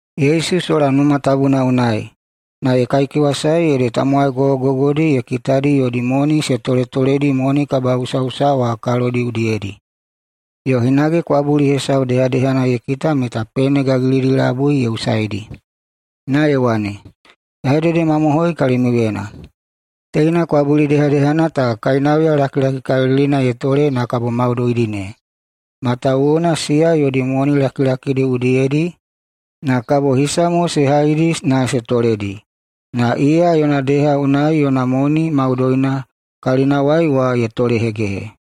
Yesu [sola Numa Tabuna unai, na] ye kaikewasae ede tamowai gogogogodi ye kitadi yodi moni se toletoledi moni kabaꞌusaꞌusa wa kalodi udiyedi. Yo hinage kwabuli hesau dehadehana ye kita meta pene gagilidi labui ye usaidi. Na ye wane, “Ya hededemamohoi kalimiuyena: Teina kwabuli dehadehana ta kainauya lakilakikalilina ye tole na kabo maudoidi ne. Matawuwuna ede siya yodi moni lakilakidi udiyedi na kabo hisa mo se haidi na se toledi, na iya yona deha unai yona moni maudoina kalinawai wa ye tolehegehe.”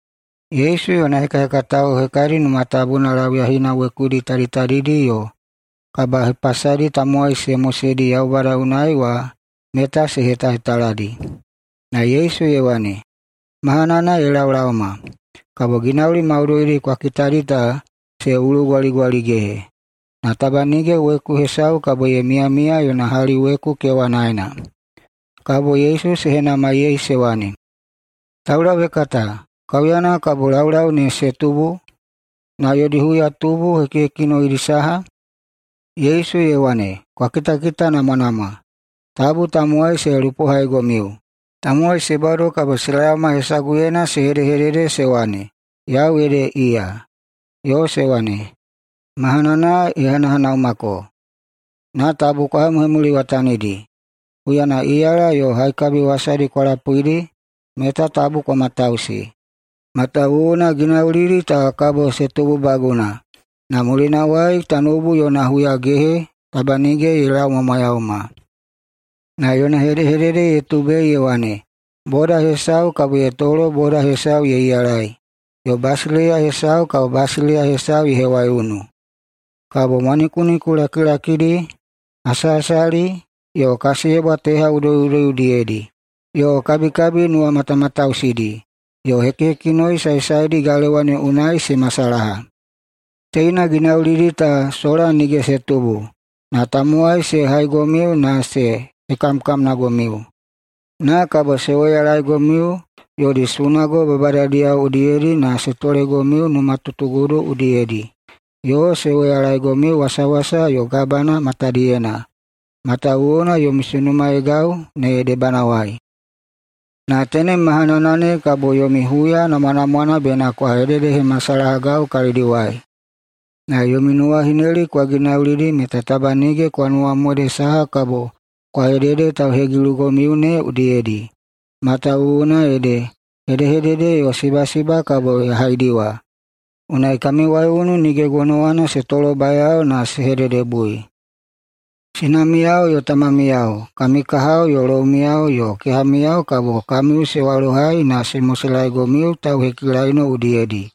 Yesu yona hekahekatao hekadi Numa Tabuna lauyahina wekudi taditadidi yo kabahepasadi tamowai se moseidi Yaubada unai wa meta se hetahetaladi. Na Yesu ye wane, “Mahanana ye laolaoma, kabo ginauli maudoidi kwa kitadi ta se ulugwaligwaligehe, na taba nige weku hesau kabo ye miyamiya yona hali weku kewanaena.” Kabo Yesu se henamaiyei se wane, “Taulauhekata, kaiuyana kabo laulau ne se tubu, na yodi huyatubu ne hekihekinoidi saha?” Yesu ye wane, “Kwa kitakitanamwanamwa! Tabu tamowai se lupohaigomiu. Tamowai se bado kabo se laoma hesaguyena se hedehedede se wane, ‘Yau ede iya,’ yo se wane, ‘Mahanana ye hanahanaumako.’ Na tabu kwa hemuhemuliwatanidi. Huyana iyala yo haikabi wasadi kwa lapuidi meta tabu kwa matausi. Matawuwuna ginaulidi ta kabo se tububaguna, na mulinawai tanoubu yona huyagehe taba nige ye laumwamwayauma.” Na yona hedehedede ye tubei ye wane, “Boda hesau kabo ye tolo boda hesau ye iyalai, yo basileiya hesau kabo basileiya hesau ye hewaiunu. Kabo mwanikuniku lakilakidi, hasahasali yo kasiyebwa teha udoi udoi udiyedi, yo kabikabi nuwamatamatausidi, yo hekihekinoi saesaedi galewa ne unai se masalaha. Teina ginaulidi ta sola nige se tubu, na tamowai se haigomiu na se hekamkamnagomiu. Na kabo se woyalaegomiu yodi sunago babadadiyao udiyedi na se tolegomiu numatutugudu udiyedi. Yo se woyalaegomiu wasawasa yo gabana matadiyena, matawuwuna yomi sunumaegau ne debanawai. Na tenem mahanana ne kabo yomi huya namwanamwana bena kwa hededehemasalahagau kalidiwai. Na yomi nuwahineli kwa ginaulidi meta taba nige kwa nuwamode saha kabo kwa hedede tauhegilugomiu ne udiyedi. Matawuwuna ede, hedehedede yo sibasiba kabo ya haidiwa, unai kami waiunu nige gonowana se tolobayao na se hededebui. Sinamiyao yo tamamiyao, kami kahao yo loumiyao yo kehamiyao kabo kamiu se walohai [na se moselaegomiu tauhekilaino udiyedi]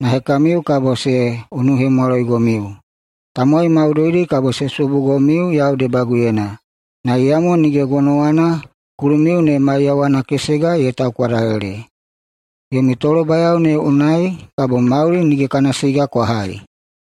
na hekamiu kabo se unuhemwaloigomiu. Tamowai maudoidi kabo se subugomiu yau debaguyena. Na iyamo nige gonowana kulumiu ne maiyawana kesega ye taukwadalele. Yomi tolobayao ne unai kabo mauli nige kana siga kwa hai.”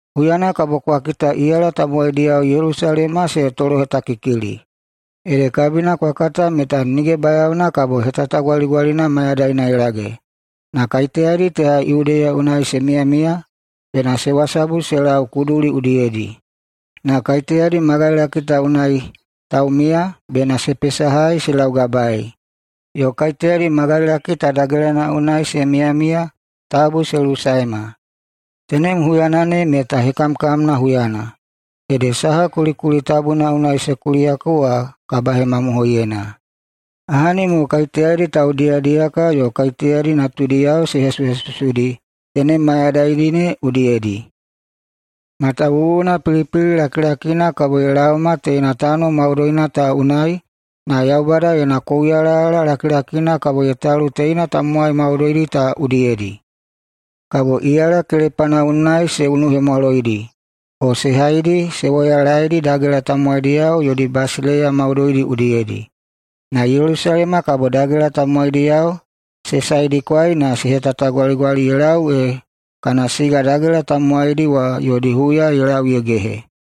“Huyana kabo kwa kita iyala tamowaidiyao Yelusalema se tolohetakikili, ede kabina kwa kata meta nige bayaona kabo hetatagwaligwalina mayadaina ye lage. Na kaiteyadi teha Yudeya unai se miyamiya, bena se wasabu se lau kuduli udiyedi. Na kaiteyadi magailaki ta unai taumiya bena se pesahai se laugabaei. Yo kaiteyadi magailaki ta dagelana unai se miyamiya, tabu se lusaema. Tenem huyana ne meta hekamkamna huyana. Ede saha kulikuli tabuna unai se kuliyako wa kabahemamohoiyena. Ahani mo kaiteyadi taudiyadiyaka yo kaiteyadi natudiyao se hesuhesusudi tenem mayadaidi ne udiyedi! Matawuwuna pilipili lakilakina kabo ye laoma teina tano maudoina ta unai na [Yaubada yona] kouyalayala lakilakina kabo ye talu teina tamowai maudoidi ta udiyedi. Kabo iyala kelepana unai se unuhemwaloidi o se haidi na se woyalaedi dagela tamowaidiyao yodi basileiya maudoidi udiyedi. Na Yelusalema kabo dagela tamowaidiyao se saedikwai na se tanuwagai ye lau ee kana siga dagela tamowaidi wa yodi huya ye lau ye gehe.”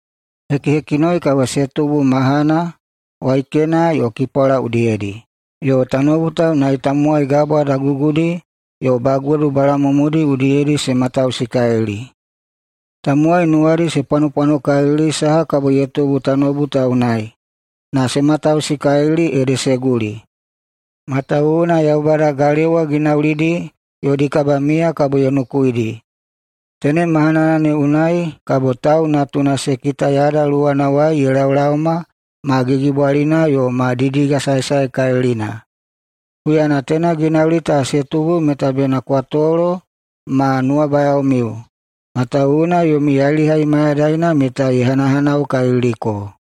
“Hekihekinoi kabo se tubu mahana, waikena yo kipwala udiyedi. Yo tanoubu ta unai tamowai gabwa dagugudi yo bagodu balamumudi udiyedi se matausikalili. Tamowai nuwadi se pwanopwanokalili saha kabo ye tubu tanoubu ta unai, na se matausikalili, ede se guli. Matawuwuna Yaubada galewa ginaulidi yodi kabamiya kabo ye nukuidi. Tenem mahanana ne unai kabo Tau Natuna se kita yada luwanawai ye laolaoma ma gigibwalina yo ma didigasaesaekalilina. Huyana teina ginauli ta se tubu meta bena kwa tolo ma nuwabayaomiu, matawuwuna yomi yailihai mayadaina meta ye hanahanaukaliliko.”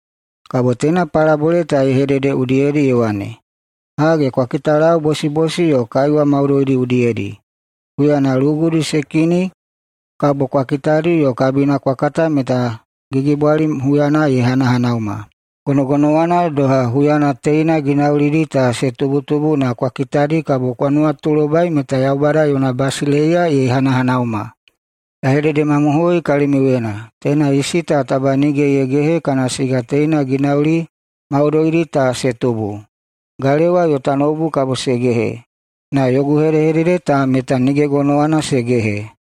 Kabo teina palabole ta ye hedede udiyedi ye wane, “Hage, kwa kitalau bosibosi yo kaiwa maudoidi udiyedi. Huyana lugudi se kini kabo kwa kitadi yo kabina kwa kata meta gigibwali huyana ye hanahanauma. Gonogonowana doha, huyana teina ginaulidi ta se tubutubu na kwa kitadi, kabo kwa nuwatulobai meta Yaubada yona basileiya ye hanahanauma. Ya hededemamohoi kalimiuyena: Teina isi ta taba nige ye gehe kana siga teina ginauli maudoidi ta se tubu. Galewa yo tanoubu kabo se gehe, na yogu hedehedede ta meta nige gonowana se gehe.”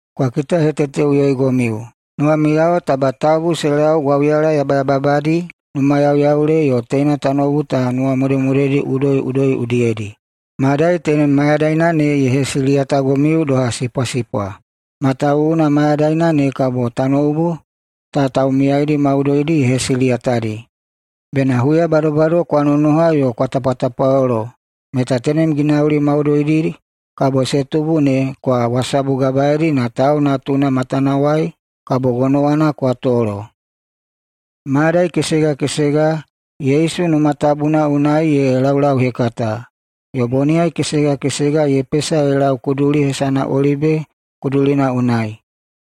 “Kwa kitaheteteꞌuyoigomiu! Nuwamiyao taba tabu se lau gwauyala yabayababadi, numayauyaule yo teina tanoubu ta nuwamodemodedi udoiꞌudoi udiyedi. Madai tenem mayadaina ne ye hesiliyatagomiu doha sipwasipwa. Matawuwuna mayadaina ne kabo tanoubu ta taumiyaidi maudoidi ye hesiliyatadi. Bena huya badobado kwa nonoha yo kwa tapwatapwalolo meta tenem ginauli maudoidi kabo se tubu ne kwa wasabugabaeidi na Tau Natuna matanawai kabo gonowana kwa tolo.” Mayadai kesega kesega Yesu Numa Tabuna unai ye laulauhekata, yo boniyai kesega kesega ye pesa ye lau kuduli hesana Olibe Kudulina unai.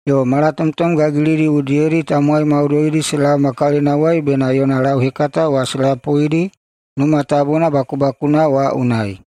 Yo malatomtom gagilidi udiyedi tamowai maudoidi se laoma kalinawai bena yona lauhekata wa se lapuidi Numa Tabuna bakubakuna wa unai.